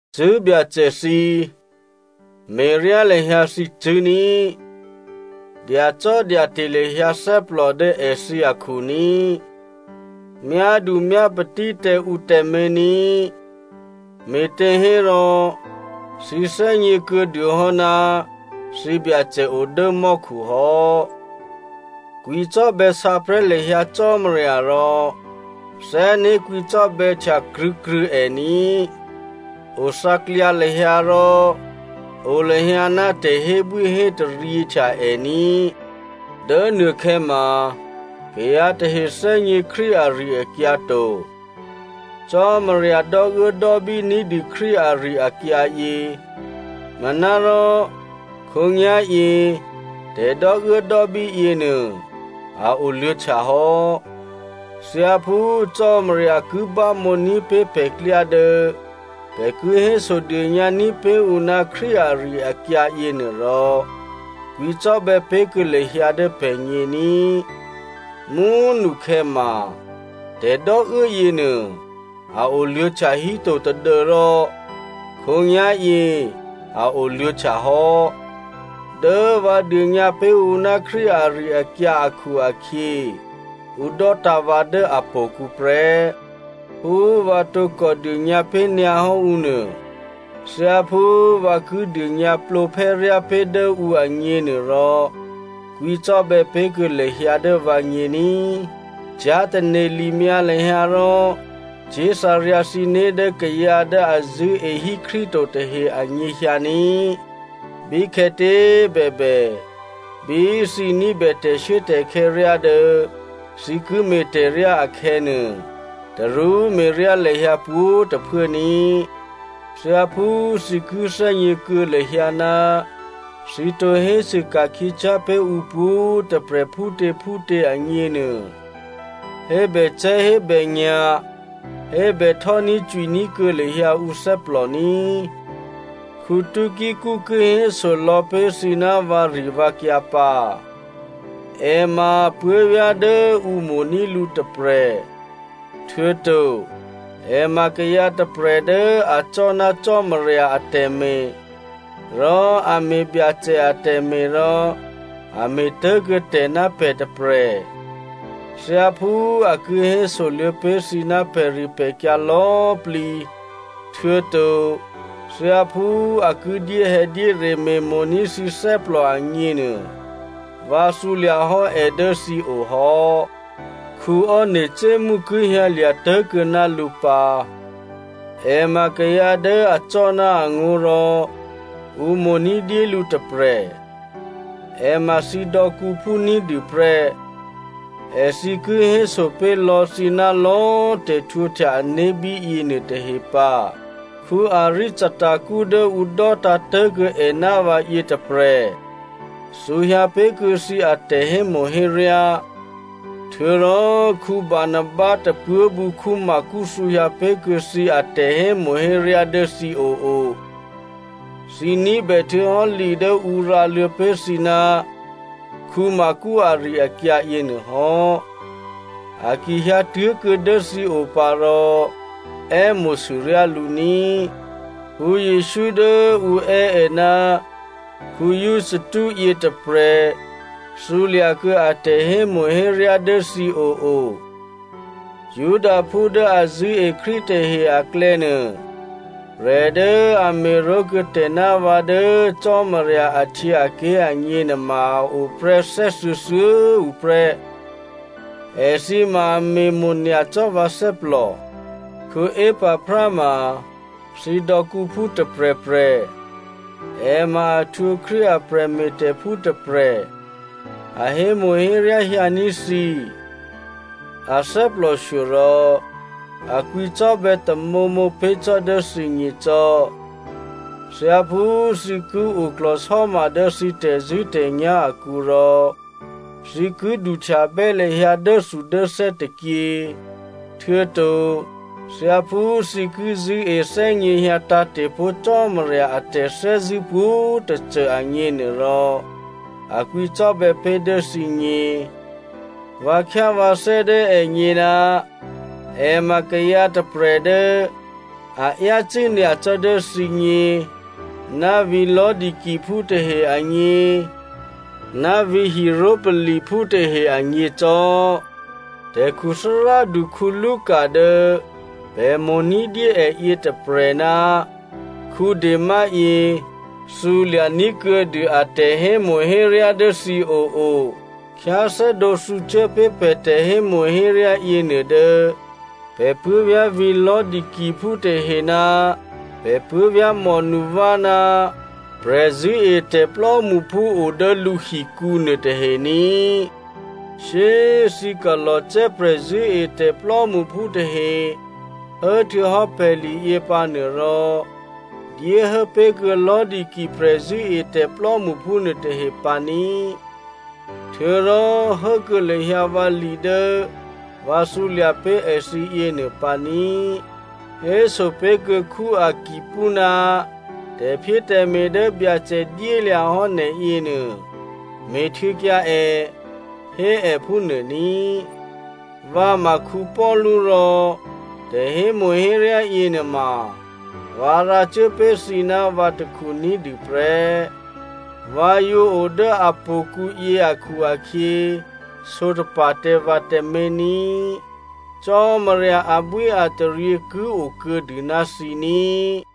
Cṳ̂́ Byacè thǐ꤮ me̤ryá lahyǎ thǐcṳ̂́ ní꤮, dyacò́dyate̤ lahyǎ thè́plò dố èthǐ akhu ní꤮, myádumyápatí tǎ ǔ tǎmé̤ ní꤮, me̤těhérò thǐ thè́gně kuô̌dû hò́ ná thǐ Byacè o dố mò́khu hò́. Kwǐcò́bè̌ sǎprè̤́ lahyǎ Cò́marya rò thè́né̤ kwǐcò́bè̌htya krṳ̂̌krṳ̂̌ è ní꤮. Othǎklyǎ lahyǎ, rò o lahyǎ ná tè̤hébwíhétaryě htya è ní꤮. Dố nuôkhè̌ma kayǎ tahe thè́gně Krístu ari-akyǎ to. Cò́marya dò́uốdò́bí ní̤dû Krístu ari-akyǎyě. Manárò khǒnyá̤yě tè̤dò́uốdò́bí yěnuô a oluô̌htya hò́. Thyáphú Cò́marya ki bámǒ ní̤pé̤ pè̤klyá dố pè̤ ki hésodônyǎ ní̤pé̤ ǔ ná Krístu ari-akyǎ yěnuôrò, kwǐcò́bè̌ pé̤kuô̌ lahyǎ dố pè̤gně ní꤮. Mú꤮ nukhè̌ma tè̤dò́uố yěnuô, a oluô̌htya híto, tadû́rò khǒnyá̤yě a oluô̌htya hò́. Dố vǎ dônyǎ pé̤ ǔ ná Krístu ari-akyǎ akhu-akhyě, ǔ dò́tǎ̤ vǎ dố htò̌kǔ prè́. Phú vǎ tǒkò dônyǎ pé̤nyǎhò́ ǔ nuô, thyáphú vǎ ki dônyǎ plǒphè́ryá pé̤ dố ǔ agně nuôrò, kwǐcò́bè̌ pé̤kuô̌ lahyǎ dố vǎgně ní꤮. Cyá̤tane̤ limyǎ lahyǎ rò cyé̤thǎryǎ thǐné̤ dố kayǎ dố a zṳ̂́ehí Krístu to tahe anyěhyǎ ní꤮. Bíkhè̌tě꤮ bèbè, bí thǐ ní̤bè tè̤shuốtè̤khè̌ ryá dố thǐ ki me̤ tè̤ryá akhè̌nuô, tarú me̤ryá lahyǎ pwǒ̤꤮ tôphuố ní꤮. Thyáphú thǐ ki thè́gně kuô̌ lahyǎ ná thǐ tǒ hésû ka̤khyěcyá̤ pé̤ ǔ pwǒ̤꤮ tôprè̤ phútěphútě agněnuô, hébècè̤́hébènya̤, hébè htò́ní̤cwiní̤ kuô̌ lahyǎ ǔ thè́plò ní꤮. Tykico ki héso lò̌pé̤ thǐ ná vǎrivǎkyǎ pǎ. È ma puố̤vyá̤ dố ǔ mo̤ní̤ lǔ tôprè̤, htuô̌to è ma kayǎ tôprè̤ dố acò́ ná Cò́marya atè̤me̤, rò a me̤ Byacè atè̤me̤ rò a me̤ tố̤kuô̌ tè̤ ná pè̤ tôprè̤. Thyáphú a ki hésoluô̌ pé̤ thǐ ná pè̤ripè̤kyǎ lò̌꤮ plǐ, htuô̌to thyáphú a ki dyéhè̌dyére me̤mo̤ní̤ thǐ thè́plò agněnuô, vǎ thǔlya̤ hò́ è dố thǐ o hò́. Onesimo ki hyǎlya̤ tố̤kuô̌ ná lǔ pǎ. È ma kayǎ dố acò́ ná angó̤ rò ǔ mo̤ ní̤dyé lǔ tôprè̤. È ma thǐ dò̌kǔphú ní̤dû prè́. Èthǐ ki héso pé̤ lò̌ thǐ ná lò̌꤮ tè̤htwǒhtya ané̤ bíyě nuôtahe pǎ. Aristarko dố ǔ dò́tǎ̤ tố̤kuô̌ è ná vǎ yětôprè̤ thǔhyǎ pé̤kuô̌ thǐ atè̤hémo̤héryá, htuô̌rò Barnaba tôpuố̤bǔ Marko thǔhyǎ pé̤kuô̌ thǐ atè̤hémo̤héryá dố thǐ oo꤮. (Thǐ ní̤bè htuô̌hò́ li dố ǔ rǎluô̌ pé̤ thǐ ná Marko ari-akyǎ yěnuôhò́. A ki hyǎtuố̤kuô̌ dố thǐ o pǎ rò è́mo̤sûryá lǔ ní꤮.) Jesǔ dố ǔ è́ è ná Justo yětôprè̤ thǔlya̤kuô̌ a tè̤hémo̤héryá dố thǐ oo. Judaphú dố a zṳ̂́e Krístu tahe aklè̌nuô, prè̤ dố a me̤ró̤ kuô̌ tè̤ ná vǎ dố Cò́marya ahtyěaké̤ agněnuô ma a oprè́ thè́thuô̌thuô̌꤮ tuô̌ prè́. Èthǐ ma a me̤mo̤ nyacò́ vǎ thè́plò. Epaphra ma thǐ dò̌kǔphú tôprè̤prè̤. È ma a htwǒ Krístu a prè̤me̤tè̤phú tôprè̤. A hémo̤héryá hyǎní̤ thǐ. A thè́plòshyo rò a kwǐcò́bè̌ tamǒmǒ pé̤ cò́ dố thǐgně cò́. Thyáphú thǐ ki oklò̤sò́ma dố thǐ tè̤zṳ̂́tè̤nyá̤ akǔ rò thǐ ki duhtyabè́ lahyǎ dốthudốthè́ tôkyě, htuô̌to thyáphú thǐ ki zṳ̂́e thè́gněhyǎ tǎ̤te̤pó̤ Cò́marya a tè̤thè́zṳ̂́ pwǒ̤꤮ tôcô agněnuôrò, a kwǐcò́bè̌ pé̤ dố thǐgně. Vǎ khyá vǎthè́ dố ègně ná è ma kayǎ tôprè̤ dố a yácû́ nyacò́ dố thǐgně ná vǐ̤ Laodiceaphú tahe agně ná vǐ̤ Hierapoliphú tahe agně cò́. Tè̤khuthárádu Luka dố pè̤ mo̤ ní̤dyé è yětôprè̤ ná Dema yě, thǔlya̤ ní̤kuô̌dû a tè̤hémo̤héryá dố thǐ oo꤮. Khyáthè́dǒ thǔcuốpé̤ pè̤ tè̤hémo̤héryá yěnuô dố pè̤ puố̤vyá̤ vǐ̤ Laodiceaphú tahe ná pè̤ puố̤vyá̤ Nympha ná prè̤zṳ̂́etè̤ plò́mṳphú odố lǔhikǔ nuôtahe ní꤮. Shyé꤮ thǐ Colossae prè̤zṳ̂́etè̤ plò́mṳphú tahe hốhtuô̌hò́ pè̤liyě pǎnuôrò, dyéhố pé̤kuô̌ Laodicea prè̤zṳ̂́etè̤ plò́mṳphú nuôtahe pǎ ní꤮. Htuô̌rò hốkuô̌ lahyǎ vǎli dố vǎ thǔlya̤ pé̤ èthǐ yěnuô pǎ ní꤮. Héso pé̤kuô̌ Arkippo, “Tè̤phyétè̤me̤ dố Byacè dyélya̤ hò́ nè̤ yěnuô, me̤htuô̌kyǎ è,” hé è phúnuô ní. Vǎ ma Paulu rò tè̤hémo̤héryá yěnuôma, vǎ rǎcuốpé̤ thǐ ná vǎ takhu ní̤dû prè́. Vǎ yǒ o dố a htò̌kǔyě akhu-akhyě, sǒtapa̤ tǎ vǎ tǎmé̤ ní꤮. Cò́marya abwíataryě ki okuô̌dû ná thǐ ní꤮.